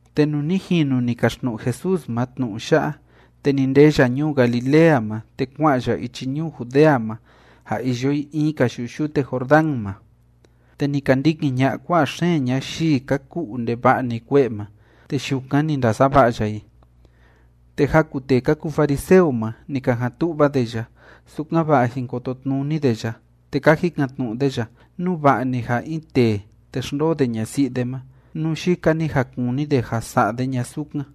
Te nuu ni jinu ni kaxtnu'u Jesús ma tnu'u ya'a, te ni ndee ya ñuu Galilea ma, te kua'an ya ichi ñuu Judea ma ja iyo i in‑ka yu'u yute Jordán ma. Te ni ka ndikin ña'a kua'a xeen ñayii ka ku'u ndeva'a‑ni kue'e ma, te yukan ni ndasava'a ya i. Te jaku tee ka kuu fariseo ma, ni ka jan tu'va de ya, sukan‑va'a jin kototnuni de ya, te ka jikan‑tnu'u de ya nú va'a‑ni ja in tee te xndoo de ñasi'i de ma, nú yika‑ni ja kuni de ja sa'a de ña sukan.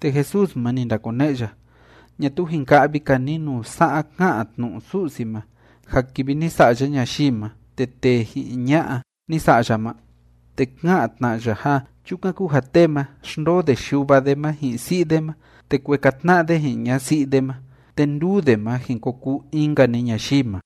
Te Jesús ma, ni ndakone'e ya: ―¿Ñatuu jin ka'vi‑ka ni nuu sa'a ká'an tnu'u Su'si ma ja kivi ni sa'a ya ñayii ma, te “tee ji'in ña'a ni sa'a ya” ma? Te ká'an tna ya ja: “Chukan kúu ja tee ma, xndoo de yuva de ma ji'in si'i de ma, te kueka tna'a de ji'in ñasi'i de ma, te nduu de ma jin ko kuu in‑nka‑ni ñayii ma.”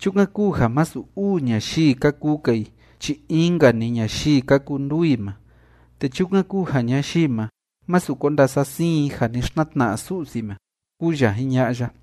Chukan kúu ja masu uu ñayii ka kuu‑ka i chi in‑nka‑ni ñayii ka kuu nduu i ma. Te chukan kúu ja ñayii ma, másu ko ndasasiin i ja ni xtnatna'a Su'si ma ―kúu ya jiña'a ya.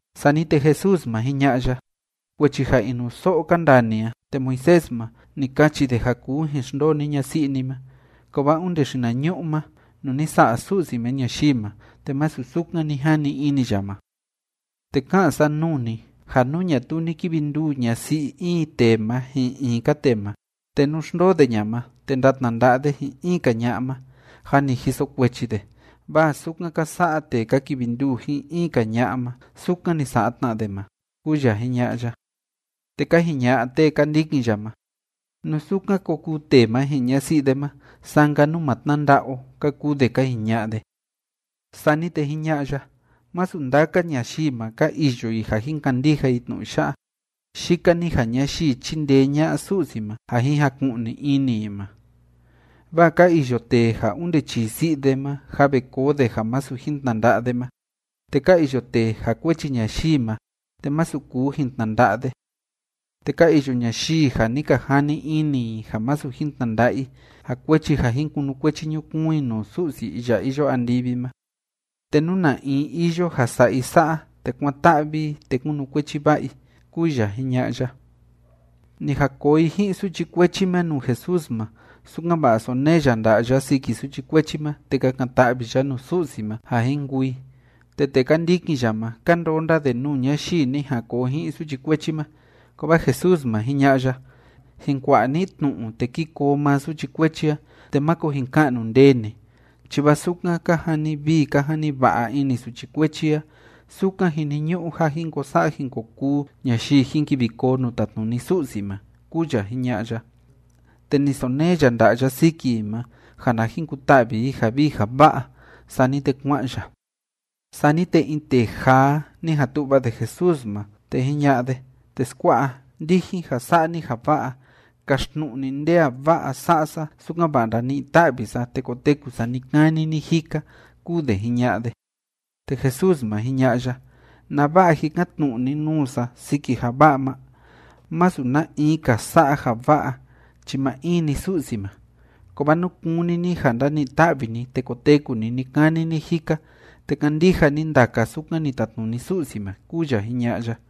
Sani te Jesús ma, jiña'a ya: ―Kuechi ja inuso'o ka ndaa ni a, te Moisés ma, ni kachi de ja kuu jin xndoo ni ñasi'i ni ma. Kovaa onde xinañu'u ma nuu ni sa'a Su'si ma ñayii ma, te masu sukan ni jani ini ya ma. Te ká'an sa nuu ni ja nú ñatuu ni kivi nduu ñasi'i in tee ma ji'in in‑ka tee ma, te nú xndoo de ña ma te ndatnanda'a de ji'in in‑ka ña'a ma, jâ ni jiso kuechi de, vaa sukan ka sa'a tee ka kivi nduu ji'in in‑ka ña'a ma, sukan ni sa'a tna de ma ―kúu ya jiña'a ya. Te ka jiña'a tee ka ndikin ya ma: ―Nú sukan ko kuu tee ma ji'in ñasi'i de ma, saa‑nka nú ma tnanda'a o ―ka kuu de ka jiña'a de. Sani te jiña'a ya: ―Masu ndaka ñayii ma, ka iyo i ja jin kandija i tnu'u ya'a, yika‑ni ja ñayii chíndee ña'a Su'si ma ja jin jaku'ni ini i ma. Vaa ka iyo tee ja onde chii si'i de ma, jâ ve koo de ja masu jin tnanda'a de ma, te ka iyo tee ja kuechi ñayii ma, te masu kuu jin tnanda'a de, te ka iyo ñayii ja ni ka jani ini i ja masu jin tnanda'a i, ja kuechi ja jin kunukuechi ñukuun i nuu Su'si iya iyo andivi ma. Te nú na in iyo ja sa'a i sa'a, te kuán‑ta'vi i, te kúnukuechi va'a i ―kúu ya jiña'a ya. Ni jan koo i ji'in suchi kuechi ma nuu Jesús ma, sukan‑va'a sonee ya nda'a ya siki suchi kuechi ma te kakan‑ta'vi ya nuu Su'si ma ja jin kuu i. Te tee ka ndikin ya ma, ka ndonda de nuu ñayii ni jan koo ji'in suchi kuechi ma. Kovaa Jesús ma, jiña'a ya: ―Jin kua'a ni tnu'u, te kí koo maa suchi kuechi a, te máko jin ka'nu ndee ni, chi vaa sukan ka jani vii ka jani va'a ini suchi kuechi a, sukan jiniñu'u ja jin ko sa'a jin ko kuu ñayii jin kivi koo nuu tatnuni Su'si ma ―kúu ya jiña'a ya. Te ni sonee ya nda'a ya siki i ma ja na jin kuta'vi i ja vii ja va'a. Sani te kua'an ya. Sani te in tee jaa, ni jan tu'va de Jesús ma, te jiña'a de: ―Teskua'a, ndijin ja sa'a ni ja va'a, kaxtnu'u ni nde a va'a sa'a sa, sukan‑va'a ndani'i ta'vi sa te koteku sa ni‑kani ni‑jika ―kúu de jiña'a de. Te Jesús ma, jiña'a ya: ―¿Nava'a jikan‑tnu'u ni nuu sa siki ja va'a ma? Masu na in‑ka sa'a ja va'a chi maa in‑ni Su'si ma. Kovaa nú kúni ni ja ndani'i ta'vi ni te koteku ni ni‑kani ni‑jika, te kandija ni ndaka sukan ni tatnuni Su'si ma ―kúu ya jiña'a ya.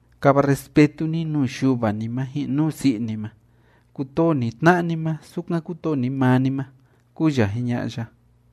Kava respetu ni nuu yuva ni ma ji'in nuu si'i ni ma. Kutoo ni tna'a ni ma, sukan kutoo ni maa ni ma ―kúu ya jiña'a ya.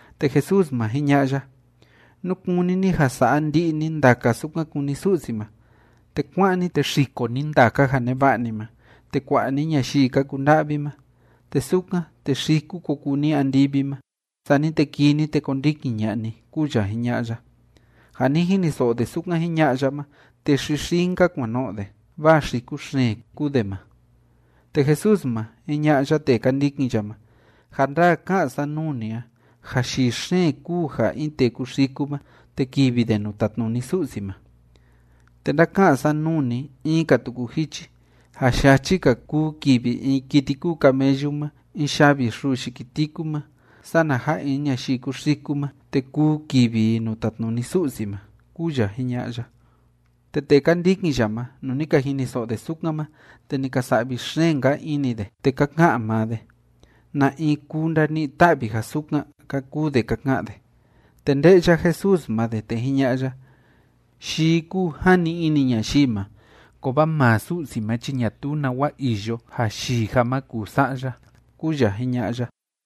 Te Jesús ma, jiña'a ya: ―Nú kúni ni ja sa'a ndi'i ni ndaka sukan kúni Su'si ma, te kuá'an ni, te xiko ni ndaka ja neva'a ni ma, te kua'a ni ñayii ka kunda'vi ma. Te sukan, te xiku ko kuu ni andivi ma. Sani te kii ni, te kondikin ña'a ni ―kúu ya jiña'a ya. Ja ni jiniso'o de sukan jiña'a ya ma, te xixii‑nka kuan no'o de, vaa xiku xeen kúu de ma. Te Jesús ma, jiña'a ya tee ka ndikin ya ma: ―Ja ndaa ká'an sa nuu ni a ja yii xeen kúu ja in tee kuxiku ma, te kivi de nuu tatnuni Su'si ma. Te ndáka'an sa nuu ni in‑ka tuku jichi ja yachi‑ka kuu kivi in kiti kúu camellu ma in yavi xuu yiki tiku ma, sana ja in ñayii kúu xiku ma, te kuu kivi i nuu tatnuni Su'si ma ―kúu ya jiña'a ya. Te tee ka ndikin ya ma, nuu ni ka jiniso'o de sukan ma, te ni ka sa'vi xeen‑nka ini de, te ka ka'an maa de: ―¿Na in kuu ndani'i ta'vi ja sukan? ―ka kuu de ka ka'an de. Te nde'ya Jesús ma de, te jiña'a ya: ―Yii kúu jani ini ñayii ma. Kovaa maa Su'si ma chi ñatuu nawa iyo ja yii ja ma kuu sa'a ya ―kúu ya jiña'a ya.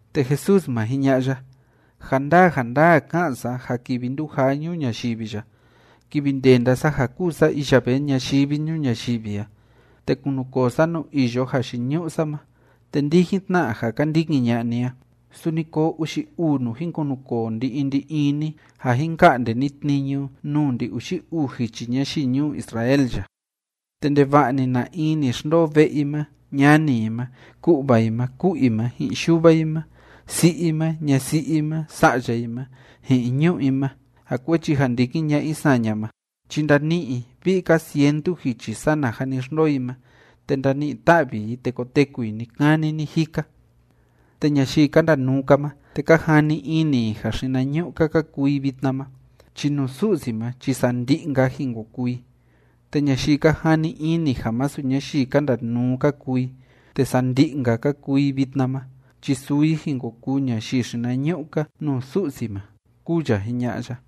Te Jesús ma, jiña'a ya: ―Ja ndaa ja ndaa ká'an sa ja kivi ndujaa ñuu ñayivi ya, kivi ndenda sa ja kúu sa iya vee ñayivi ñuu ñayivi a, te kunukoo sa nuu iyo jayiñu'u sa ma, te ndijin tna ja ka ndikin ña'a ni a, suni koo uxi uu nuu jin kunukoo ndi‑in ndi‑in ni ja jin ka'nde ni tniñu nuu ndi‑uxi uu jichi ñayii ñuu Israel ya. ’Te ndeva'a‑ni na in ni xndoo ve'e i ma, ñani i ma, ku'va i ma, ku'u i ma, ji'in yuva i ma, si'i i ma, ñasi'i i ma, sa'ya i ma, ji'in ñu'ú i ma, ja kuechi ja ndikin ña'a i saña ma chi ndani'i i vi'i‑ka cientu jichi sana ja ni xndoo i ma, te ndani'i‑ta'vi i, te koteku i ni‑kani ni‑jika. Te ñayii ka ndanuu‑ka ma te ka jani ini i ja xinañu'u‑ka ka kuu i vitna ma, chi nuu Su'si ma chi sandi'i‑nka jin ko kuu i, te ñayii ka jani ini ja masu ñayii ka ndanuu ka kuu i, te sandi'i‑nka ka kuu i vitna ma chi suu i jin ko kuu ñayii xinañu'u‑ka nuu Su'si ma ―kúu ya jiña'a ya.